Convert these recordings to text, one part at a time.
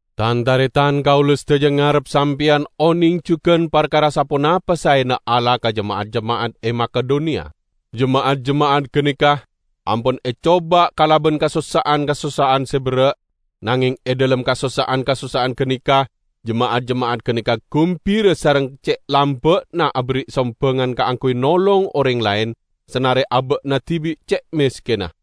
Tan-taretan, kaula sadaja ngarep sampeyan oneng jugan parkara saponapa saena Allah ka jema'at-jema'at e Makedoniya. Jema'at-jema'at ganeka ampon ecoba kalaban kasossa'an-kasossa'an se berra'. Nangeng e dhalem kasossa'an-kasossa'an ganeka jema'at-jema'at ganeka gumbira sareng ce' lamba'na aberri' sombangan kaangguy nolong oreng laen, sanare aba'na dibi' ce' meskenna.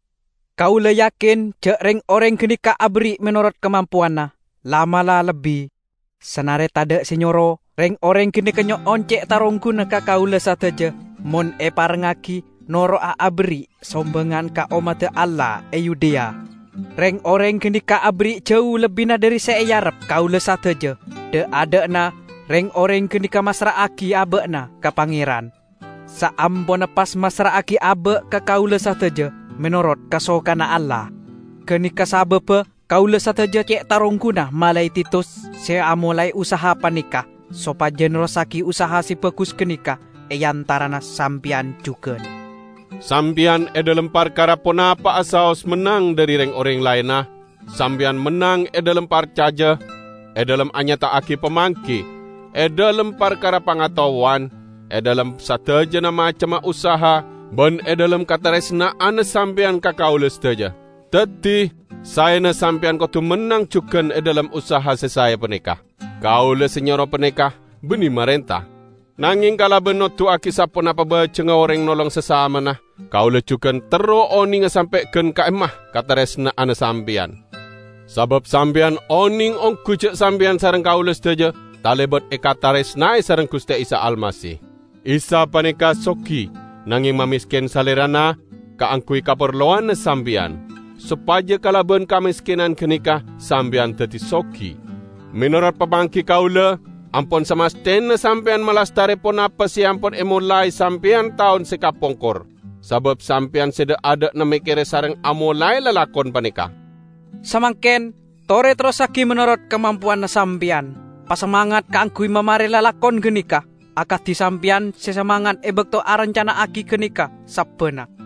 Kaula yakin ja' reng-oreng ganeka aberri' menorot kamampowanna, la'-mala' lebbi. Sanare tadha' se nyoro, reng-oreng ganeka nyo'on ce' tarongguna ka kaula sadaja mon eparengngagi noro'a aberri' sombangan ka ommadda Allah e Yudea. Reng-oreng ganeka aberri' jau lebbina dhari se earep kaula sadaja. Dha'-adha'na reng-oreng ganeka massra'agi aba'na ka Pangeran, saamponna pas massra'agi aba' ka kaula sadaja, menorot kasokanna Allah. Ganeka sababba kaula sadaja ce' tarongguna malae Titus -- se amolae usaha paneka -- sopaja nerrossagi usaha se bagus ganeka e antarana sampeyan jugan. Sampeyan e dhalem parkara ponapa'a saos mennang dhari reng-oreng laenna: Sampeyan mennang e dhalem parcaja, e dhalem anyata'agi pamanggi, e dhalem parkara pangataowan, e dhalem sadajana macemma usaha, ban e dhalem kataresna'anna sampeyan ka kaula sadaja. Daddi, saena sampeyan kodu mennang jugan e dhalem usaha se sae paneka. Kaula se nyoro paneka banne marenta. Nangeng kalaban noduwagi saponapa bajengnga oreng nolong sasamana, kaula jugan terro onenga sampe' gan ka'imma kataresna'anna sampeyan. Sabab sampeyan oneng onggu ja' sampeyan sareng kaula sadaja talebat ekataresnae sareng Guste Isa Almasih. Isa paneka sogi, nangeng mamesken Salerana kaangguy kaparlowanna sampeyan, sopaja kalaban kameskenan ganeka, sampeyan daddi sogi. Menorot pamanggi kaula, ampon samasthena sampeyan malastare ponapa se ampon emolae sampeyan taon se kapongkor. Sabab sampeyan se dha'-adha'na mekkere sareng amolae lalakon paneka. Samangken, tore terrossagi menorot kamampowanna sampeyan. Pasamangat kaangguy mamare lalakon ganeka, akadi sampeyan se samangat e bakto arancana'agi ganeka sabbanna.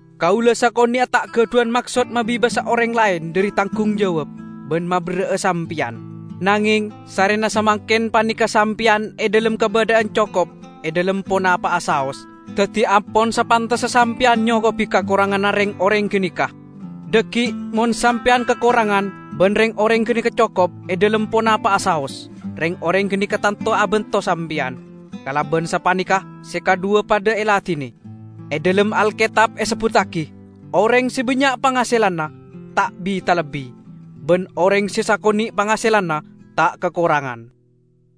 Kaula sakone'a ta' gadhuwan maksod mabebasa oreng laen dhari tanggung jawab, ban maberra'a sampeyan. Nangeng, sarrena samangken paneka sampeyan e dhalem kabadha'an cokop e dhalem ponapa'a saos, daddi ampon sapantessa sampeyan nyokobi kakoranganna reng-oreng ganeka. Dhaggi' mon sampeyan kakorangan, ban reng-oreng ganeka cokop e dhalem ponapa'a saos, reng-oreng ganeka tanto abanto sampeyan. Kalaban sapaneka se kadhuwa padha eladine. E dhalem Alketab esebbuttagi, "Oreng se bannya' pangaselanna, ta' bi-talebbi; ban oreng se sakone' pangaselanna, ta' kakorangan."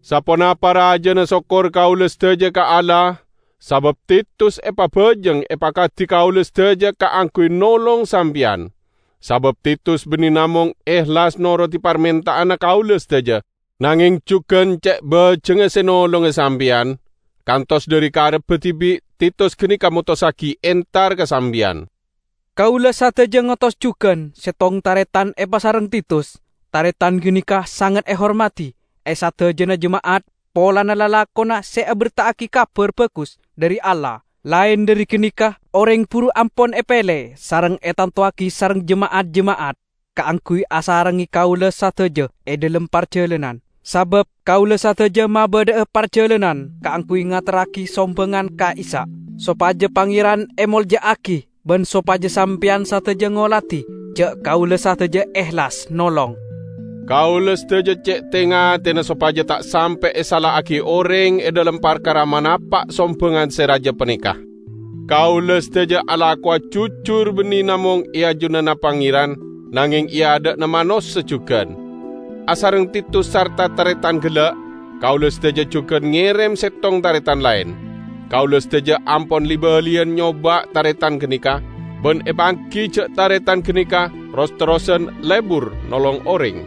Saponapa rajana sokkor kaula sadaja ka Allah sabab Titus epabajeng epakadi kaula sadaja kaangguy nolong sampeyan! Sabab Titus banne namong ehlas norodi parmenta'anna kaula sadaja, nangeng jugan ce' bajengnga se nolonga sampeyan, kantos dhari karebba dibi' Titus ganeka motossagi entar ka sampeyan. Kaula sadaja ngotos jugan settong taretan epasareng Titus; taretan ganeka sanget ehormadi e sadajana jema'at polana lalakonna se aberta'agi Kabar Bagus dhari Allah. Laen dhari ganeka, oreng buru ampon epele sareng etantowagi sareng jema'at-jema'at kaangguy asarengnge kaula sadaja e dhalem parjalanan. Sabab kaula sadaja mabadha'a parjalanan kaangguy ngaterragi sombangan ka'issa', sopaja Pangeran emolja'agi ban sopaja sampeyan sadaja ngoladi ja' kaula sadaja ehlas nolong. Kaula sadaja ce' te-ngatena sopaja ta' sampe' esala'agi oreng e dhalem parkara manapa' sombangan se raja paneka. Kaula sadaja alakowa jujur banne namong e ajunanna Pangeran, nangeng e adha'na manossa jugan. Asareng Titus sarta taretan gella', kaula sadaja jugan ngerem settong taretan laen. Kaula sadaja ampon li-baliyan nyoba' taretan ganeka, ban epanggi ja' taretan ganeka ros-terrosan lebur nolong oreng.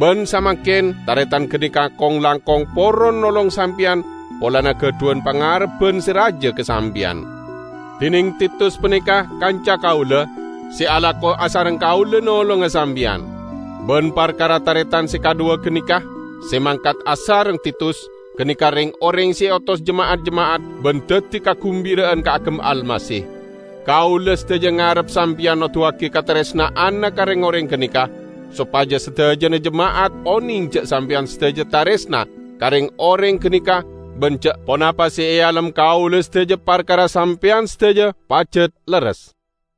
Ban samangken, taretan ganeka kong-langkong poron nolong sampeyan polana gadhuwan pangarebban se raja ka sampeyan. Dineng Titus paneka kanca kaula, se alako asareng kaula nolonga sampeyan. Ban parkara taretan se kadhuwa ganeka, se mangkat asareng Titus, ganeka reng-oreng se eotos jema'at-jema'at ban daddi kagumbira'an kaagem Almasih. Kaula sadaja ngarep sampeyan noduwagi kataresna'anna ka reng-oreng ganeka, sopaja sadajana jema'at oneng ja' sampeyan sadaja taresna ka reng-oreng ganeka ban ja' ponapa se ealem kaula sadaja parkara sampeyan sadaja pajat lerres.